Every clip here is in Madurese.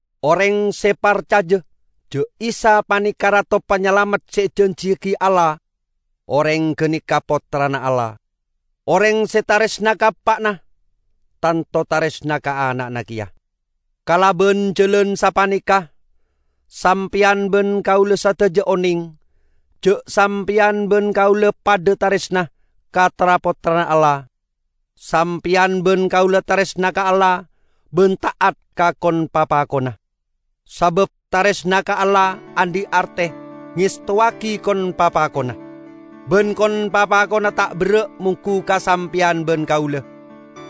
Oreng se parcaja ja' Isa paneka Rato Panyalamet se ejanjiyagi Allah, oreng ganeka pottrana Allah. Oreng se taresna ka eppa'na, tanto taresna ka ana'na keya. Kalaban jalan sapaneka sampeyan ban kaula sadaja oneng ja' sampeyan ban kaula padha taresna ka tra-pottrana Allah: Sampeyan ban kaula taresna ka Allah ban ta'at ka kon-papakonna. Sabab taresna ka Allah andhi' arte ngestowagi kon-papakonna. Ban kon-papakonna ta' berra' monggu ka sampeyan ban kaula,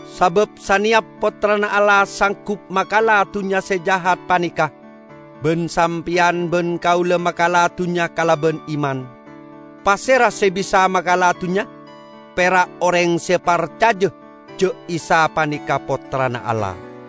sabab saneyap pottrana Allah sanggup makala dunnya se jahat paneka. Ban sampeyan ban kaula makala dunnya kalaban iman. Pasera se bisa makala dunnya? Pera' oreng se parcaja ja' Isa paneka Pottrana Allah.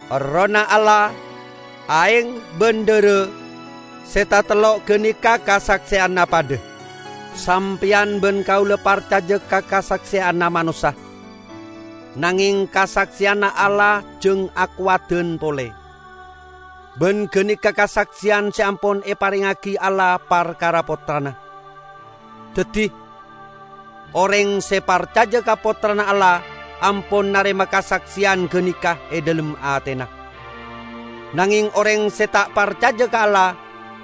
Errohna Allah, aeng ban dhara -- se tatello' ganeka kasakseyanna padha. Sampeyan ban kaula parcaja ka kasakseyanna manossa, nangeng kasakseyanna Allah jang akowadan pole. Ban ganeka kasakseyan se ampon eparengngagi Allah parkara Pottrana. Daddi, oreng se parcaja ka Pottrana Allah, ampon narema kasakseyan ganeka e dhalem atena; nangeng oreng se ta' parcaja ka Allah,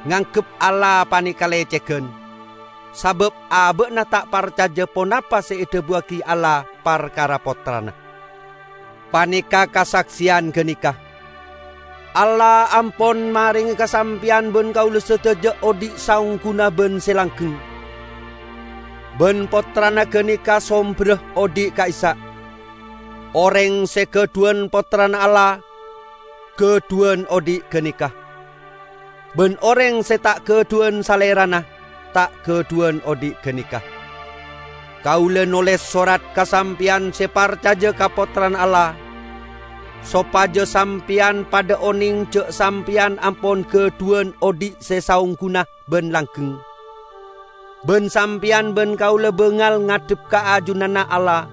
nganggep Allah paneka lecegan, sabab aba'na ta' parcaja ponapa se edhabuwagi Allah parkara Pottrana. Paneka' kasakseyan ganeka: Allah ampon marenge ka sampeyan ban kaula sadaja odhi' saongguna ban se langgeng, ban Pottrana ganeka somberra odhi' ka'issa'. Oreng se gadhuwan Pottrana Allah, gadhuwan odhi' ganeka; ban oreng se ta' gadhuwan Salerana, ta' gadhuwan odhi' ganeka. Kaula noles sorat ka sampeyan se parcaja ka Pottrana Allah, sopaja sampeyan padha oneng ja' sampeyan ampon gadhuwan odhi' se saongguna ban langgeng. Ban sampeyan ban kaula bangal ngadhep ka ajunanna Allah,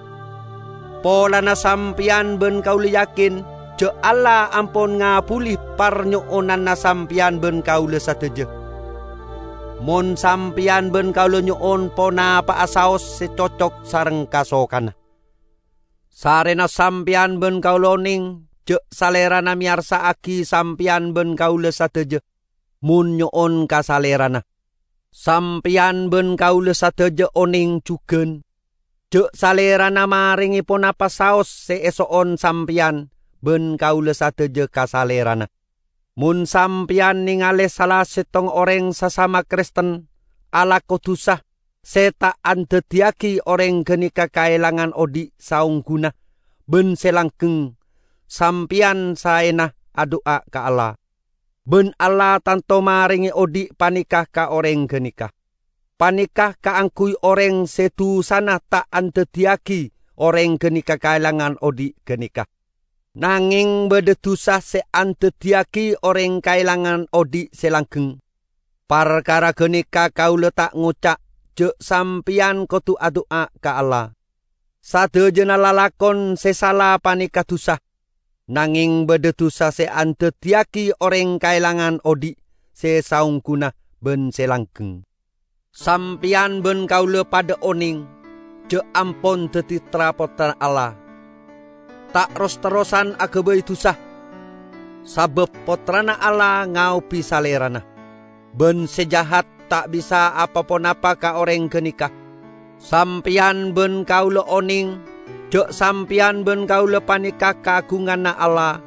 polana sampeyan ban kaula yakin ja' Allah ampon ngabbuli parnyo'onanna sampeyan ban kaula sadaja, mon sampeyan ban kaula nyo'on ponapa'a saos se cocok sareng kasokanna. Sarrena sampeyan ban kaula oneng ja' Salerana meyarsa'agi sampeyan ban kaula sadaja mon nyo'on ka Salerana, sampeyan ban kaula sadaja oneng jugan ja' Salerana marenge ponapa saos se eso'on sampeyan ban kaula sadaja ka Salerana. Mon sampeyan nengale sala settong oreng sasama Kristen alako dusa se ta' andaddiyagi oreng ganeka kaelangan odhi' saongguna ban se langgeng sampeyan saena adu'a ka Allah; ban Allah tanto marenge odhi' paneka ka oreng ganeka. Paneka kaangguy oreng se dusana ta' andaddiyagi oreng ganeka kaelangan odhi' ganeka. Nangeng badha dusa se andaddiyagi oreng kaelangan odhi' se langgeng. Parkara ganeka kaula ta' ngoca' ja' sampeyan kodu adu'a ka Allah. Sadajana lalakon se sala paneka dusa, nangeng badha dusa se andaddiyagi oreng kaelangan odhi' se saongguna ban se langgeng. Sampeyan ban kaula padha oneng ja' ampon daddi tra-pottrana Allah, ta' ros-terrosan agabay dusa, sabab Pottrana Allah ngaobi salerana, ban Se Jahat ta' bisa apa-ponapa ka oreng ganeka. Sampeyan ban kaula oneng ja' sampeyan ban kaula paneka kaagunganna Allah,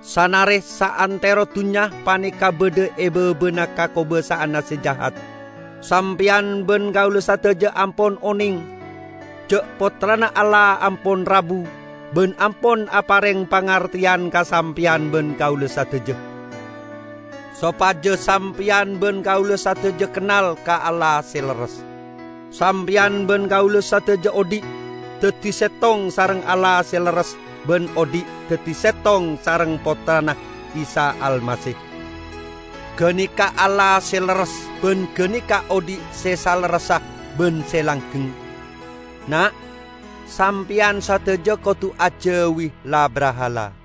sanare saantero dunnya paneka badha e babana kakobasa'anna Se Jahat. Sampeyan ban kaula sadaja ampon oneng ja' Pottrana Allah ampon rabu ban ampon apareng pangarteyan ka sampeyan ban kaula sadaja, sopaja sampeyan ban kaula sadaja kennal ka Allah se lerres. Sampeyan ban kaula sadaja odhi' daddi settong sareng Allah se lerres ban odhi' daddi settong sareng Pottrana Isa Almasih. Ganeka Allah se lerres ban ganeka odhi' se salerressa ban se langgeng. Na', sampeyan sadaja kodu ajauwi la-brahala!